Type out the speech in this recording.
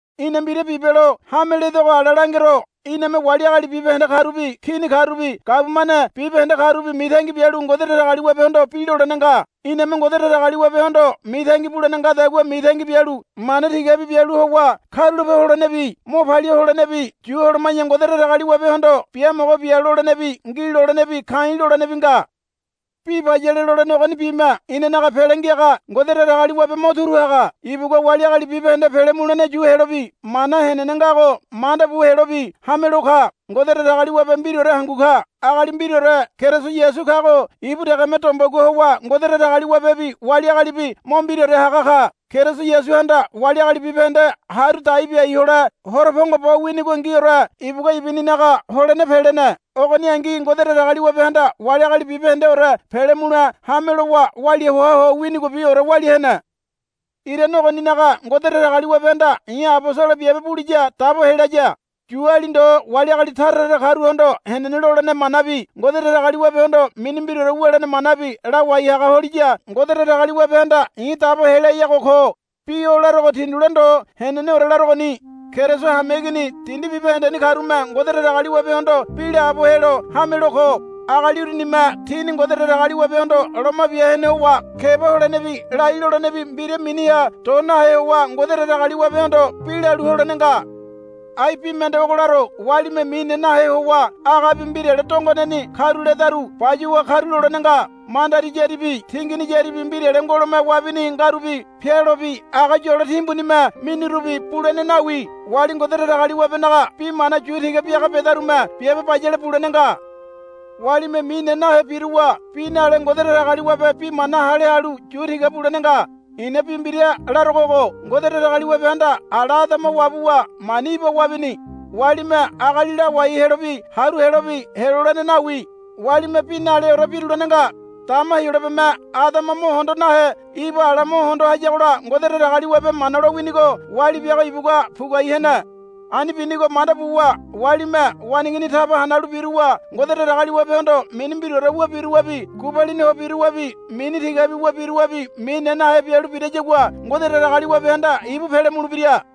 Í̠na mbira bibelo hame ledogo ala langero. Iname wali agali bibahende karubi kini karubi gabumane bibahende karubi mitangi bialu Ngode Datagaliwabehondo bi lolene nga. Iname Ngode Datagaliwabehondo mitangi bulene ngadagua mitangi bialu mana tigabi bialu howa karulape holenebi mo palia holenebi yu holoma̱ya Ngode Datagaliwabehondo, Biamogo bia, lolenebi, Ngi, lolenebi, Ka̱i̱, lolenebi nga. Bi bayale lolene ogonibime inanaga Pele Ngiaga Ngode Datagaliwabe mo turu haga. Ibugua wali agali bibahende pele mulene yu helobi mana henene ngago manda bu helobi hamelo ka. Ngode Datagaliwabe mbiraore hangu ka. Agali mbiraore Keriso Yasu kago ibu degeme dombegua howa Ngode Datagaliwabebi wali agalibi mo mbiraore haga ka. Keriso Yasuhanda wali agali bibahende haru dai biai hole horo pongo bo winigongiore ibugua ibuninaga holene pelene. Ogoningi Ngode Datagaliwabehanda wali agali bibahendeore pele mule hame lowa walia hoa ho winigobiore walia hene. Irane ogoninaga Ngode Datagaliwabehanda i̱ abosolo biabe buliya dabo helaya. Yuali ndo wali agali tara tara karuhondo henene lolene manabi Ngode Datagaliwabehondo mini mbiraore wulene manabi lawai haga holiya Ngode Datagaliwabehanda i̱ dabo heleayago ko. Bi o larogo tindule ndo heneneore larogoni. Keriso hameigini dindi bibahendeni karume Ngode Datagaliwabehondo bi laabo helo hamelo ko. Agali urunime tini Ngode Datagaliwabehondo loma bia hene howa keba holenebi lai lolenebi mbira miniha do nahe howa Ngode Datagaliwabehondo bi lalu holene nga. Ai bi mende ogo laro. Walime mine nahe howa agabi mbirale dongoneni karuledaru bayuwa karulolene nga. Mandari yáribi tingini yáribi mbirale ngolome wabini ngarubi pealobi aga yolo timbunime minirubi bulene nawi. Wali Ngode Datagaliwabenaga bi mana yu tiga biaga bedarume biabe bayale bulene nga. Walime mine nahe biruwa bi nale Ngode Datagaliwabe bi mana hale halu yu tiga bulene nga. I̱na bi mbira larogo ogo. Ngode Datagaliwabehanda ala Adama wabuwa mani Iba wabini. Walime agali lawai helobi haru helobi helolene nawi. Walime bi naleore birulene nga. Dama Heyolabeme Adama mo hondo nahe Iba ala mo hondo hayagola Ngode Datagaliwabe mana lowinigo wali biago ibugua puguai hene. Ani binigo manda buwa walime waneigini taba hanalu biruwa Ngode Datagaliwabehondo mini mbiraore wu biruwabi gubalini ho biruwabi mini tigabi wu biruwabi mine nahe bialu birayagua Ngode Datagaliwabehanda ibu pele mulebira.